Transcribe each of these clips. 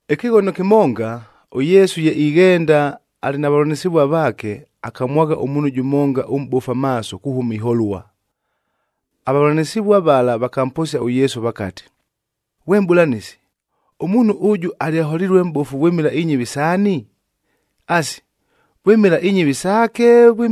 Ɨkɨghono kɨmonga, ʉYesu ye ighenda, alɨ na vavʉlanɨsɨvua vaake, akamwagha ʉmuunhu jʉmonga ʉmʼbofu amaaso kuhʉma iholua. Avavʉlanɨsɨvua vala vakamposia ʉYesu vakati, “Ghwe Mʼbʉlanɨsi, ʉmuunhu ʉjʉ alyaholilue mʼbofu vwɨmɨla inyɨvi saani? Asi, vwɨmɨla inyɨvi saake,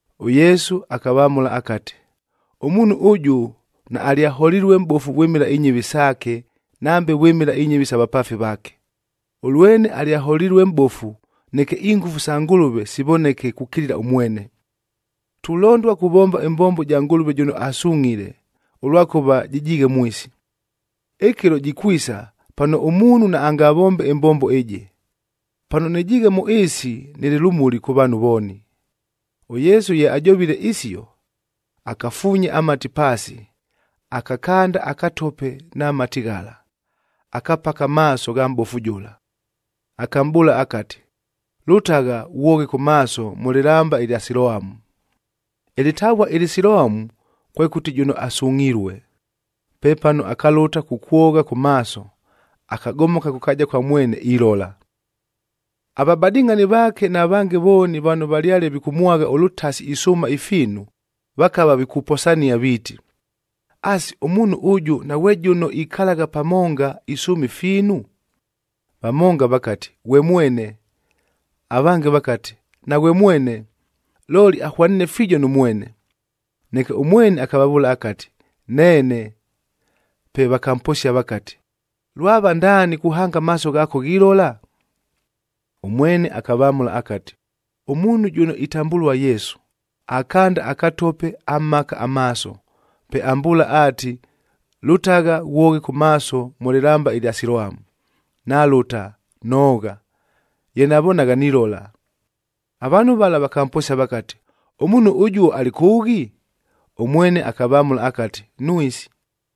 ɄYesu akavamʉla akati, “Ʉmuunhu ʉjʉ naalyaholilue mʼbofu vwɨmɨla inyɨvi saake, nambe vwɨmɨla inyɨvi isa vapaafi vaake. Ʉlwene alyaholilue mʼbofu, neke ingʉfu sa Ngʉlʉve sivoneke kukilila ʉmwene. Tulondua kuvomba ɨmbombo ɨja Ngʉlʉve jʉno asungʼhile, ʉlwakʉva jɨjiighe mwisi. Ɨkɨlo jikwisa pano ʉmuunhu naangavombe ɨmbombo ɨjɨ. Pano nɨjiighe mʉ ɨɨsi, nɨlɨ lʉmuli kʉ vaanhu vooni.” ɄYesu ye ajovile isio, akafuunya amati paasi, akakanda akatope na mati ghala, akapaka amaaso gha mʼbofu jʉla. Akamʼbʉʉla akati, “Lʉtagha ghwoghe kʉ maaso mʉ lɨlamba ɨlya Siloamu.” Ɨlɨtavua ɨlɨ Siloamu kwekʉti jʉno asungʼhilue. Pepano akalʉta kukwogha kʉ maaso, akagomoka kʉ kaaja kwa mwene ilola. Avabadɨngʼhani vaake na vange vooni vano valyale vikʉmwagha ʉlʉtasi isʉʉma ifiinu, vakava vikuposania viiti, “Asi, ʉmuunhu ʉjʉ naghwe jʉno ikalagha pamonga isʉʉma ifiinu?” Vamonga vakati, “Ghwe mwene.” Avange vakati, “Naghwe mwene, looli ahwaniine fiijo nʉ mwene.” Neke ʉmwene akavavʉʉla akati, “Neene!” Pe vakamposia vakati, “Lwava ndaani kuhanga amaaso ghaako ghilola?” Ʉmwene akavamʉla akati, “Ʉmuunhu jʉno itambʉlua Yesu, akanda akatope amhaka amaaso, pe ambʉʉla aati, ‘Lʉtagha ghwoghe kʉ maaso mʉ lɨlamba ɨlya Siloamu.’ Nalʉta, noogha, ye navonagha nilola.” Avaanhu vala vakamposia vakati, “Ʉmuunhu ʉjuo alɨ kʉʉghi?” Ʉmwene akavamʉla akati, “Nwisi.”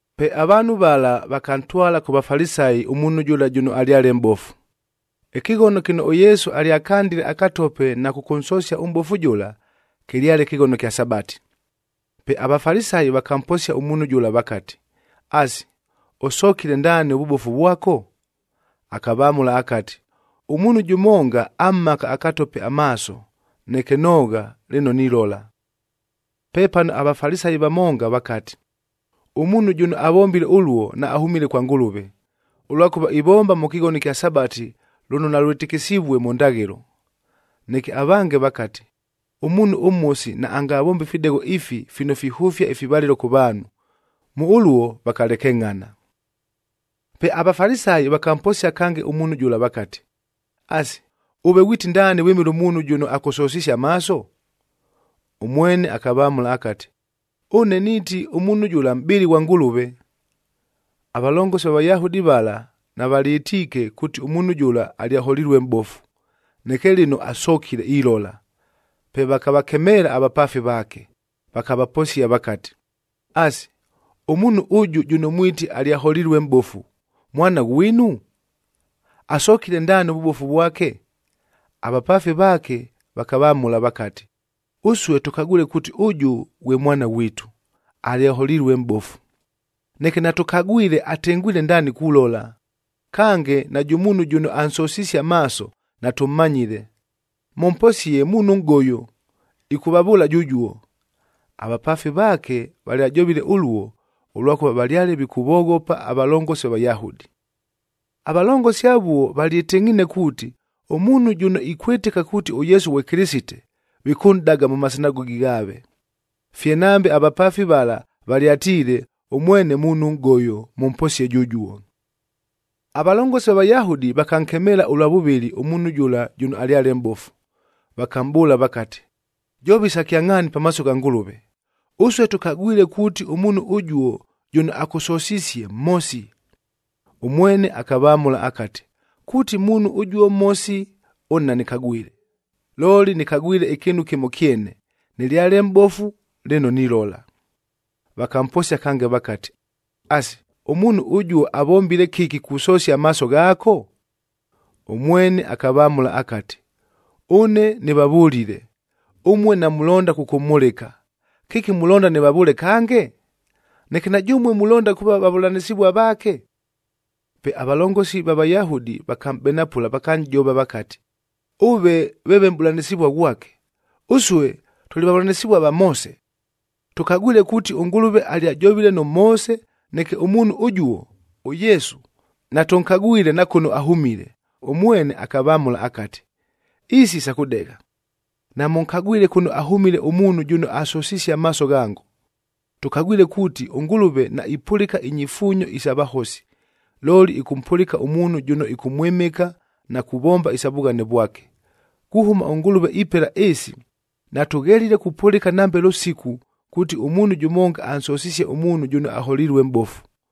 Pe avaanhu vala vakantwala kʉ Vafalisayi ʉmuunhu jʉla jʉno alyale mʼbofu. Ɨkɨghono kɨno ʉYesu alyakandile akatope na kʉkʉnsosia ʉmʼbofu jʉla, kɨlyale kɨghono kya Sabati. Pe aVafalisayi vakamposia ʉmuunhu jʉla vakati, “Asi, ʉsokile ndaani ʉvʉbofu vwako?” Akavamʉla akati, “Ʉmuunhu jʉmonga amhaka akatope amaaso, neke noogha, lɨno nilola.” Pepano aVafalisayi vamonga vakati, “Ʉmuunhu jʉno avombile ʉluo naahʉmile kwa Ngʉlʉve, ʉlwakʉva ivomba mʉ kɨghono ɨkya Sabati lʉno nalwɨtɨkɨsivue mʉ ndaghɨlo.” Neke avange vakati, “Ʉmuunhu ʉmhosi naangavombe ifidegho ifi fino fihʉfia ifivalɨlo kʉ vaanhu.” Mʉ ʉluo vakalekengʼhana. Pe aVafalisayi vakamposia kange ʉmuunhu jʉla vakati, “Asi, ʉve ghwiti ndaani vwɨmɨla ʉmuunhu jʉno akʉsosisie amaaso?” Ʉmwene akavamʉla akati, “Ʉne niiti ʉmuunhu jʉla mʼbɨli ghwa Ngʉlʉve.” Avalongosi va Vayahudi vala navalyɨtiike kuuti ʉmuunhu jʉla alyaholilue mʼbofu, neke lɨno asokile ilola. Pe vakavakemeela avapaafi vaake, vakavaposia vakati, “Asi, ʉmuunhu ʉjʉ jʉno mwiti alyaholilue mʼbofu, mwana ghwinu? Asokile ndaani ʉvʉbofu vwake?” Avapaafi vaake vakavamʉla vakati, “Ʉsue tʉkagwile kuuti ʉjʉ ghwe mwana ghwitu, alyaholilue mʼbofu. Neke natʉkagwile atengwile ndaani kulola. Kange, najʉ muunhu jʉno ansosisie amaaso, natʉmmanyile. Mʉmposie, muunhu nʼgoyo, ɨkʉvavʉʉla jʉjuo.” Avapaafi vaake valyajovile ʉluo, ʉlwakʉva valyale vikʉvoghopa avalongosi va Vayahudi. Avalongosi avuo valyɨtɨngʼhiine kuuti, ʉmuunhu jʉno ikwɨtɨka kuuti ʉYesu ghwe Kɨlɨsite, vikʉnʼdaga mʉ masinagogi ghaave. Fye nambe avapaafi vala valyatiile, “Ʉmwene muunhu nʼgoyo, mʉmposie jʉjuo.” Avalongosi va Vayahudi vakankemeela ʉlwa vʉvɨlɨ ʉmuunhu jʉla jʉno alyale mʼbofu, vakamʼbʉʉla vakati, “Jova isa kyangʼhaani pamaaso gha Ngʉlʉve! Ʉsue tʉkagwile kuuti ʉmuunhu ʉjuo jʉno akʉsosisie, mhosi.” Ʉmwene akavamʉla akati, “Kuuti ʉmuunhu ʉjuo mhosi, ʉne nanɨkagwile, looli nɨkagwile ɨkɨɨnu kɨmo kyene, nɨlyale mʼbofu, lɨno nilola.” Vakamposia kange vakati, “Asi, ʉmuunhu ʉjuo avombile kɨki kusosia amaaso ghaako?” Ʉmwene akavamʉla akati, “Ʉne nɨvavʉlile, ʉmue namulonda kʉkʉmhʉlɨka. Kɨki mulonda nɨvavʉʉle kange? Neke na jʉmue mulonda kuuva vavʉlanɨsɨvua vaake?” Pe avalongosi ava Vayahudi vakamʼbenapʉla vakanʼjova vakati, “Ʉve veeve mʼbʉlanɨsɨvua ghwake! Ʉsue tʉlɨ vavʉlanɨsɨvua va Moose. Tʉkagwile kuuti ʉNgʉlʉve alyajovile nʉ Moose, neke ʉmuunhu ʉjuo, ʉYesu, natʉnkagwile na kʉno ahʉmile.” Ʉmwene akavamʉla akati, “Isi sa kʉdegha! Namʉnkagwile kʉno ahʉmile ʉmuunhu jʉno asosisie amaaso ghango! Tʉkagwile kuuti ʉNgʉlʉve naipʉlɨka inyifuunyo isa vahosi,b looli ɨkʉmpʉlɨka ʉmuunhu jʉno ɨkʉmwɨmɨka na kuvomba isa vughane vwake. Kuhʉma ʉNgʉlʉve ipela ɨɨsi, natʉghelile kupʉlɨka nambe lʉsiku kuuti ʉmuunhu jʉmonga ansosisie ʉmuunhu jʉno aholilue mʼbofu!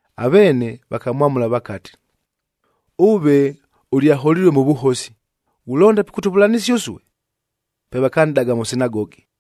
Aveene vakamwamʉla vakati, “Ʉve ʉlyaholilue mʉ vʉhosi, ghulonda pikʉtʉvʉlanɨsia ʉsue?” Pe vakanʼdaga mʉ sinagogi.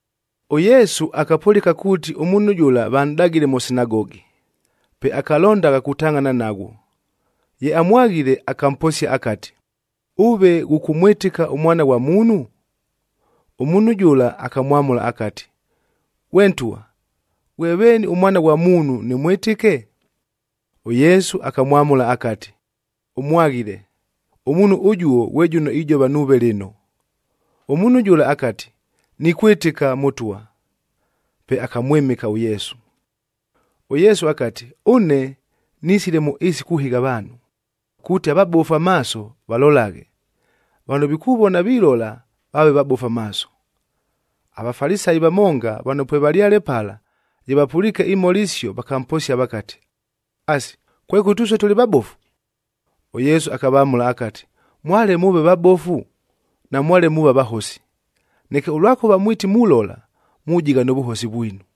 ɄYesu akapʉlɨka kuuti ʉmuunhu jʉla vanʼdagile mʉ sinagogi. Pe akalondagha kutangʼhana naghwo. Ye amwaghile, akamposia akati, “Ʉve ghʉkʉmwɨtɨka ʉMwana ghwa Muunhu?” Ʉmuunhu jʉla akamwamʉla akati, “Ghwe ntwa, ghwe veeni ʉMwana ghwa Muunhu, nɨmwɨtɨke?” ɄYesu akamwamʉla akati, “Ʉmwaghile, ʉmuunhu ʉjuo ghwe jʉno ijova nuuve lɨno.” Ʉmuunhu jʉla akati, “Nikwɨtɨka, Mʉtwa!” Pe akamwɨmɨka ʉYesu. ɄYesu akati, “Ʉne nisile mʉ ɨɨsi kuhɨgha avaanhu, kuuti avabofu amaaso, valolaghe; vano vikuvona vilola, vaave vabofu amaaso.” AVafalisayi vamonga vano pwevalyale pala, ye vapʉliike imhola isio, vakamposia vakati, “Asi, kwekʉti ʉsue tʉlɨ vabofu?” ɄYesu akavamʉla akati, “Mwale mʉʉve vabofu, namwale muuva vahosi. Neke ʉlwakʉva mwiti mulola, mujigha nʉ vʉhosi vwinu.”